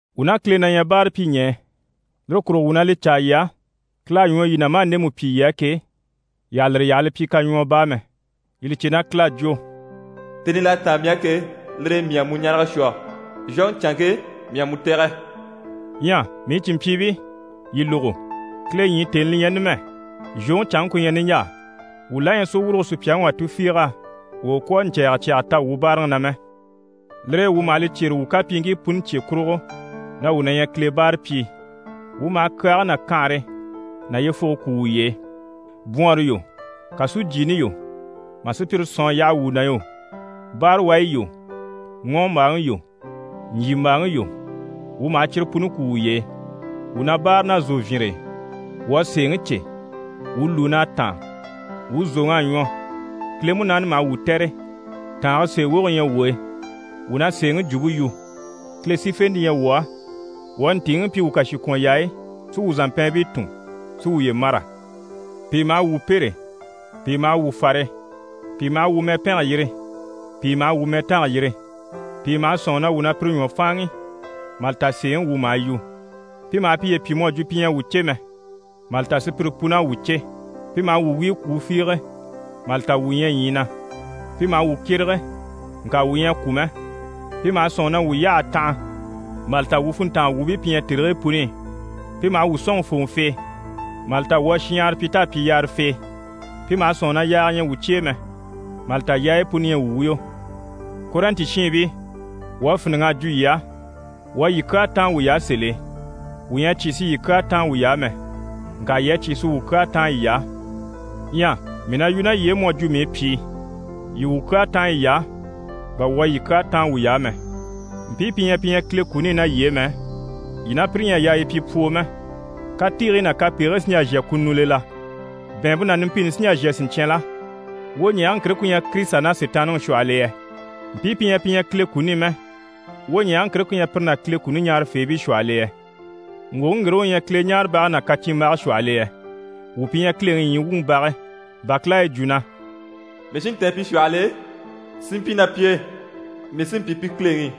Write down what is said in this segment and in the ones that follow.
Wuu ná Kile na ɲyɛ báarapyiɲɛɛ. Lire kurugo wuu na li caa yii á, Kile à ɲwɔ yii na maa ndemu pyi yii á ke, yii àha lire yaha li pyi kaɲwɔɔ baa mɛ. Yii li cè na Kile à jwo: «Tèni l'à táan mii á ke, lire e mii à mu ɲarege shwɔ, zhwoŋi canŋke, mii à mu tɛ̀gɛ.» Ɲyɛ mii cìnmpyiibii, yii lógo, Kile ɲyii tèni li ɲyɛ numɛ, zhwoŋi canŋke ku ɲyɛ niɲjaa. Wuu la ɲyɛ sì wurugo sùpyaŋi wà tufiig'á, wà u kwɔ̀ a ɲcɛ̀ɛgɛ cyaga ta wuu báaraŋi na mɛ. Lire e wuu maha li cyêre wuu kapyiiŋkii puni cye kurugo na wuu na ɲyɛ Kile báarapyii. Wuu maha kyaage ná kanhare ná yyefuge kwú wuye e. Bwɔɔnre yo, kàsujyiini yo, mà sùpyire sɔ̀n a yaha wuu na yo, báarawayi yo, ŋɔ́ɔmbaaŋi yo, ɲjyìmbaaŋi yo, wuu maha cyire puni kwú wuye e. Wuu na báare ná zòvyinre e, wuu à sèeŋi cè. Wuu lùun'à táan, wuu zòŋ'à ɲwɔ. Kile Munaani maha wuu tɛ̀re, tàange sèe woge na ɲyɛ wuu e. Wuu na sèeŋi jwumpe yu, Kile sífente na ɲyɛ wuu á. Wuu à ntìiŋi pyi wuu kàshikwɔnyaayi, si wuu zàmpɛɛnbii tùn, si wuye mâra. Pìi maha wuu pêre, pìi maha wuu fare, pìi maha wuu mɛpɛnge yîri, pìi maha wuu mɛtange yîri. Pìi maha sɔ̂nŋi na wuu maha pire ɲwɔ fáanŋi, mà li ta sèeŋi wuu maha yu. Pi maha piye pyi mu à jwo pi ɲyɛ a wuu cè mɛ, mà li ta sùpyire pun'à wuu cè. Pi maha wuu wíi kwùu fiige, mà li ta wuu ɲyɛ ɲyii na. Pi maha wuu kyérege, ŋka wuu ɲyɛ a kwû mɛ. Pi maha sɔ̂nŋi na wuu yyah'à tanha, mà li ta wuu funntanga wuubii pi ɲyɛ tèrigii puni i. Pi maha wuu sɔ̂nŋi fòŋɔfee, mà li ta wuu à shinɲyahara pyi t'à pyi yaarafee. Pi maha sɔ̂nŋi na yaaga ɲyɛ wuu cye e mɛ, mà li ta yaayi puni ɲyɛ wuu wuyo. Kɔrɛnti shiinbii, wuu à fíniŋ'a jwo yii á. Wuu à yii kyaa táan wuy'á sèl'e. Wuu ɲyɛ a cyé si yii kyaa táan wuy'á mɛ, ŋka yii à cyé si wuu kyaa táan yiy'á. Ɲyɛ mii na yu ná yii e mu à jwo mii pyìi. Yii wuu kyaa táan yiy'á, bà wuu à yii kyaa táan wuy'á mɛ. Mpii pi ɲyɛ pi ɲyɛ Kile kuni i ná yii e mɛ, yii ná pire ɲyɛ a yaa yii pyi pwoo mɛ. Katiigii ná kapegigii sí n‑jà n‑shà kununi i la? Bɛ̀ɛnmpe ná numpini sí n‑jà n‑shà siɲcyan la? Wwoɲɛɛge ŋkire ku ɲyɛ Kirisita ná Sitaanniŋi shwɔhɔl'e yɛ? Mpii pi ɲyɛ pi ɲyɛ Kile kuni i mɛ, wwoɲɛɛge ŋkire ku ɲyɛ pire ná Kile kuni ɲaarafeebii shwɔhɔl'e yɛ? Ŋgwòŋi ŋgire u ɲyɛ Kileɲaarebage ná kacyinmbage shwɔhɔl'e yɛ? Wuu pi ɲyɛ Kileŋi ɲyii wuŋi bage, bà Kile à yi jwo na: «Mii sí n‑tɛ̀ɛn pi shwɔhɔl'e, si mpyi ná pi e. Mii sí n‑pyi pi Kileŋi,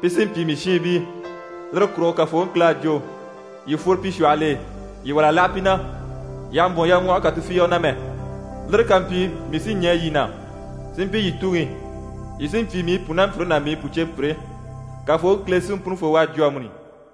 pi sí n‑pyi mii shiinbii. Lire kurugo Kafooŋi Kile à jwo: “Yii fworo pi shwɔhɔl'e, yii wâl'a láha pi na, yii àha mbwɔ̀n yaɲwɔhɔge kà tufiige na mɛ. Lire ká mpyi, mii sí ɲɛɛ yii na, si mpyi yii Tuŋi, yii sí n‑pyi mii pùnampyire ná mii pùceepyire.” Kafooŋi Kile Siŋi Punifoo u à jwo amuni.»